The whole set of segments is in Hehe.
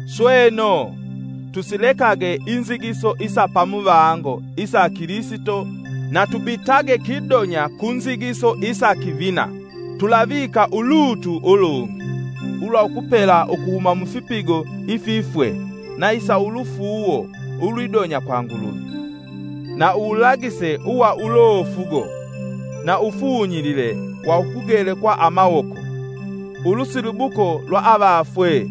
Sweno, tusilekage inzigiso isa pamuvango isa Kilisito na tubitage kidonya ku nzigiso isa kivina, tulavika ulutu ulungi ulwa ukupela ukuhuma mufipigo ififwe na isa ulufuuwo ulwidonya kwa Nguluvi. na uwulagise uwa ulofugo, na uwufunyilile wa ukugelekwa amawoko, ulusilibuko lwa avafwe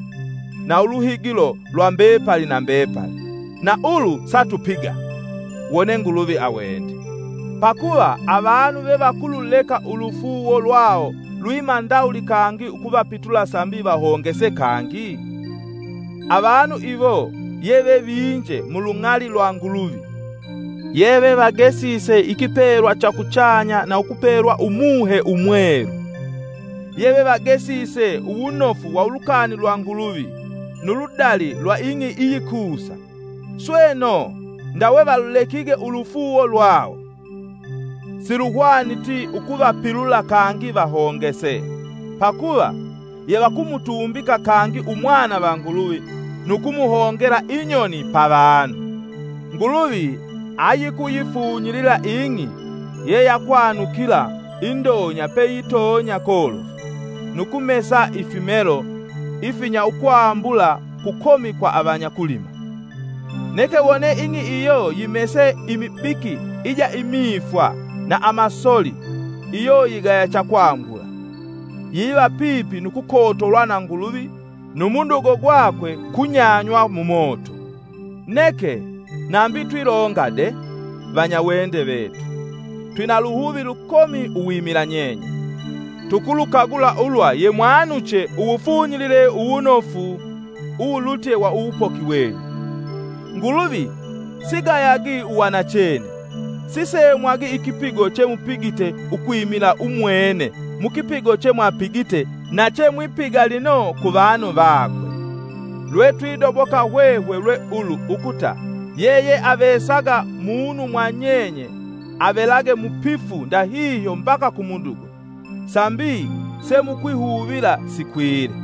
na uluhigilo lwa mbepali na mbepali. Na ulu satupiga! Wone Nguluvi awende. Pakuva avanu vevakululeka ulufuuwo lwawo lwiima ndawuli kangi ukuvapilula sambi vahongese kangi? Avanu iwo yeve vinje mulung'ali lwa Nguluvi, yevevagesise ikipelwa cha kuchanya na ukupelwa Umuhe Umwelu; yevevagesise uwunofu wa ulukani lwa Nguluvi nu ludali lwa ing'i iyikusa, Sweno, ndawe valulekige ulufuuwo lwawo! Siluhwaniti ukuvapilula kangi vahongese, pakuva yevakumutumbika kangi Umwana va Nguluvi nu kumuhongela inyoni pavanu. Nguluvi ayikuyifunyilila ing'i yeyakwanukila indonya peyitonya kolofu, nu kumesa ifimelo ifinya ukwambula kukomi kwa avanya kulima. Neke wone ing'i iyo yimese imibiki ija imifwa na amasoli, iyo yigaya cha kwambula; yiva pipi nu kukotolwa na Nguluvi nu mudugo gwakwe kunyanywa mu moto. Neke, nambi twilonga de, vanyawende vetu, twina luhuvi lukomi uwimila nyenye. Tukulukagula ulwa yemwanuche uwufunyilile uwunofu uwulutye wa uwupoki wenyu. Nguluvi sigayagi uwanachene; sisemwagi ikipigo chemupigite ukwimila umwene mukipigo chemwapigite na chemwipiga lino ku vanu vakwe. Lwetwidoboka hwehwe lwe ulu ukuta yeyeavesaga munu mwa nyenye avelage mupifu ndahihyo mbaka ku mudugo, sambi semukwihuvila sikwile.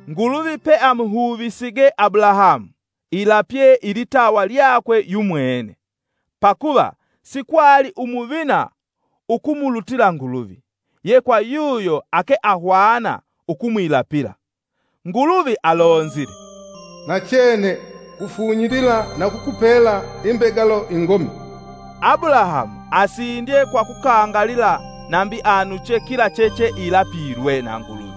Nguluvi peamuhuvisige Abulahamu, ilapye ilitawa lyakwe yumwene, pakuva sikwali umuvina ukumulutila Nguluvi, ye kwa yuyo ake ahwana ukumwilapila. Nguluvi alonzile, “Nachene ngufunyilila na ukukupela imbegalo ingomi.” Abulahamu asindye kwa kukangalila nambi anuche kila checheilapilwe na Nguluvi.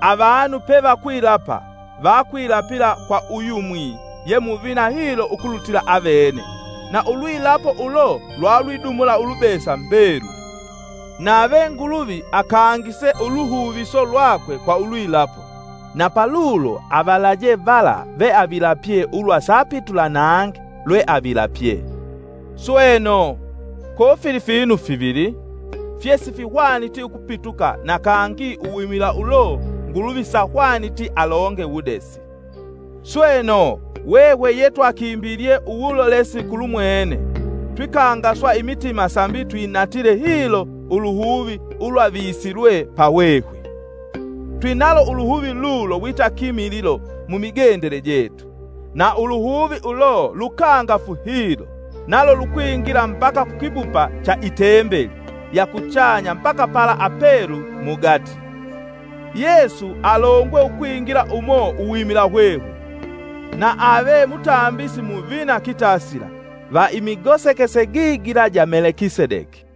Avanu pevakwilapa vakwilapila kwa uyumwi ye muvina hilo ukulutila aveve na ulwilapo ulo lwalwidumula ulubesa mbeluli. Nave Nguluvi akangise uluhuviso lwakwe kwa ulwilapo; na palulo avalaje vala veavilapye ulwa sapitula nangi lweavilapye. Sweno, kofili finu fivili: fyesihwaniti ukupituka na kangi uwimila ulo Nguluvi sahwaniti alonge wudesi. Sweno, hwehwe yetwakimbilye uwulolesi kulumwene twikangaswa imitima sambi twinatile hilo uluhuvi ulwavisilwe pa hwehwe. Twinalo uluhuvi lulo wita kimililo mumigendele jetu. Na uluhuvi ulo lukangafu hilo, nalo lukwingila mbaka kukibupa cha itembeli ya kuchanya mbaka pala apelu mugati. Yesu alongwe ukwingila umo uwimila hwehwe, na ave mutambisi muvina kitasila, va imigosekese gigila ja Melekisedeki.